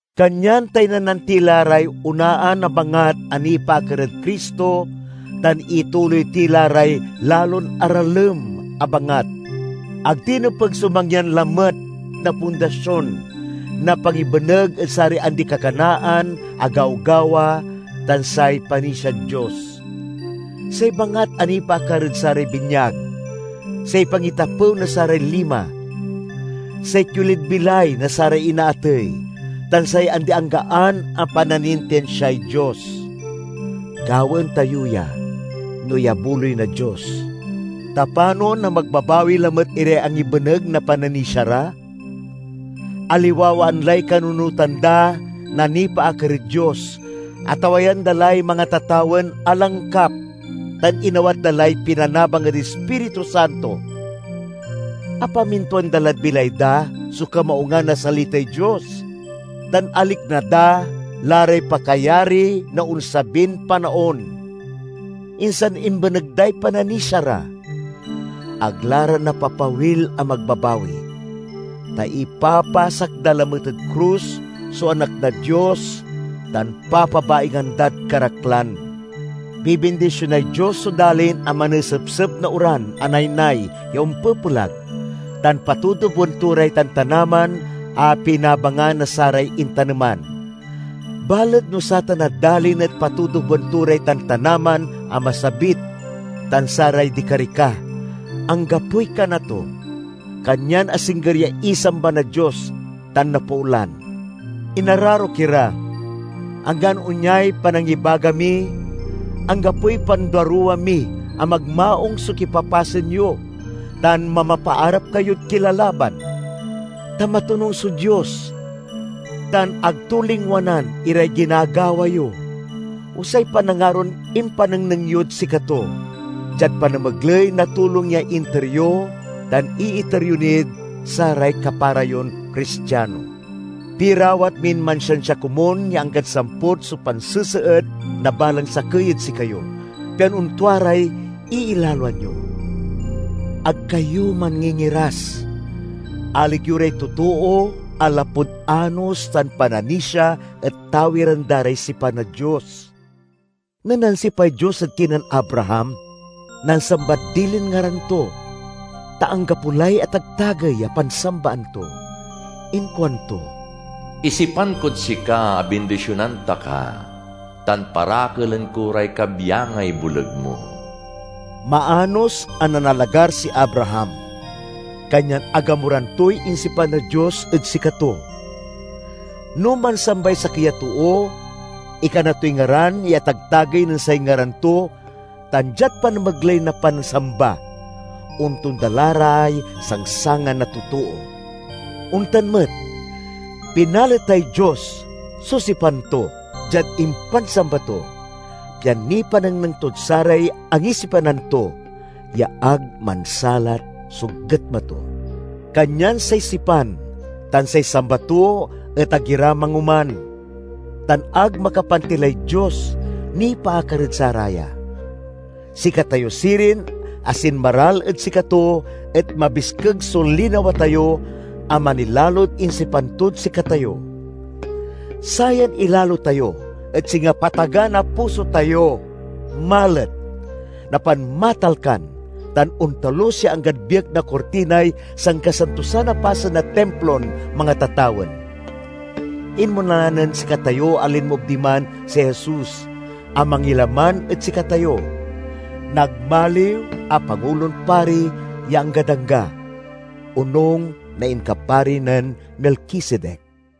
Kanyan taynanan ti la ray onaan a bangat a nipaakar ed Cristo tan ituloy ti la ray lalon aralem a bangat. Ag ti nepeg so mangyan lamet na pundasion na pangibeneg ed saray andi-kakanaan a gawgawa tan say panisiad Dios; say bangat a nipaakar ed saray binyag, say pangitapew na saray lima; say kiolid bilay na saray inaatey, tan say andi-anggaan a pananintinsiay Dios. Gawaen tayo ya, no iyabuloy na Dios. Ta panon a magbabawi lamet iray angibeneg na pananisia ra? Aliwawaan lay kanunotan da na nipaakar ed Dios, atawayan da lay mangatatawen a langkap, tan inawat da lay pinanabang ed Ispiritu Santo. Apamintuan da lad bilay da so kamaungan na salitay Dios, tan alikna da la ray pakayari na onsabin panaon. Insan imbeneg day pananisia ra! Ag la ra napapawil a magbabawi, ta ipapasak da lamet ed krus so Anak na Dios tan papabaingan dad karaklan. Bibindisionay Dios so dalin a manesepsep na oran a naynay ya ompepelag, tan patutuboen to ray tantanaman a pinabangan na saray intaneman. Balet no satan a dalin et patutuboen to ray tantanaman a masabit tan saray dikarika, anggapoy kana to; kanyan asingger ya isamba na Dios tan napoolan. Inararok ira, anggan onyay panangibaga mi, anggapoy panduaruwa mi a magmaung so kipapasen yo tan mamapaarap kayod kilalaban. Ta matonung so Dios tan ag to lingwanan iray ginagawa yo, o say panangaron impanengneng yod sikato diad panamegley na tulong ya inter yo tan iiter yo nid saray kapara yon Cristiano. Pirawat min mansiansia komun ya anggad samput so panseseet na balang sakey ed sikayo, pian ontua ray iilaloan yo. Ag kayo manngingiras. Alig yo ray totoo a lapud anos tan pananisia et tawiren da ray sipan na Dios. Nen nansipay Dios ed kinen Abraham, nansambad dilin ngaran to, ta anggapo lay atagtagey a pansambaan to. Inkuanto, "Isipan kod sika a bindisionan ta ka, tan parakelen ko ray kabyangay boleg mo." Maanos a nanalagar si Abraham, kanyan agamuran toy insipan na Dios ed sikato. No mansambay sakey a too ikana toy ngaran ya atagtagey nen say ngaran to tan diad panamegley na pansamba, ontonda la ray sangsangan na totoo. Ontan met, pinaletay Dios so sipan to diad impansamba to, pian nipanengneng tod saray angisipanan to ya ag mansalat so getma to. Kanyan say sipan tan say samba to et ag ira mangoman, tan ag makapantilay Dios nipaakar ed saraya. Sikatayo sirin a sinmaral ed sikato et mabiskeg so linawa tayo a manilalod insipan tod sikatayo. Sayan ilalo tayo et singa pataga na puso tayo—malet, napanmatalkan, tan ontalus ya anggad biek na kurtinay sankasantosan a pasen na Timplon mangatatawen. Inmona nen sikatayo a linmoob diman si Jesus a mangilaman ed sikatayo. Nagmaliw a pangulon pari ya anggad angga, onung na inkapari nen Melkisedek.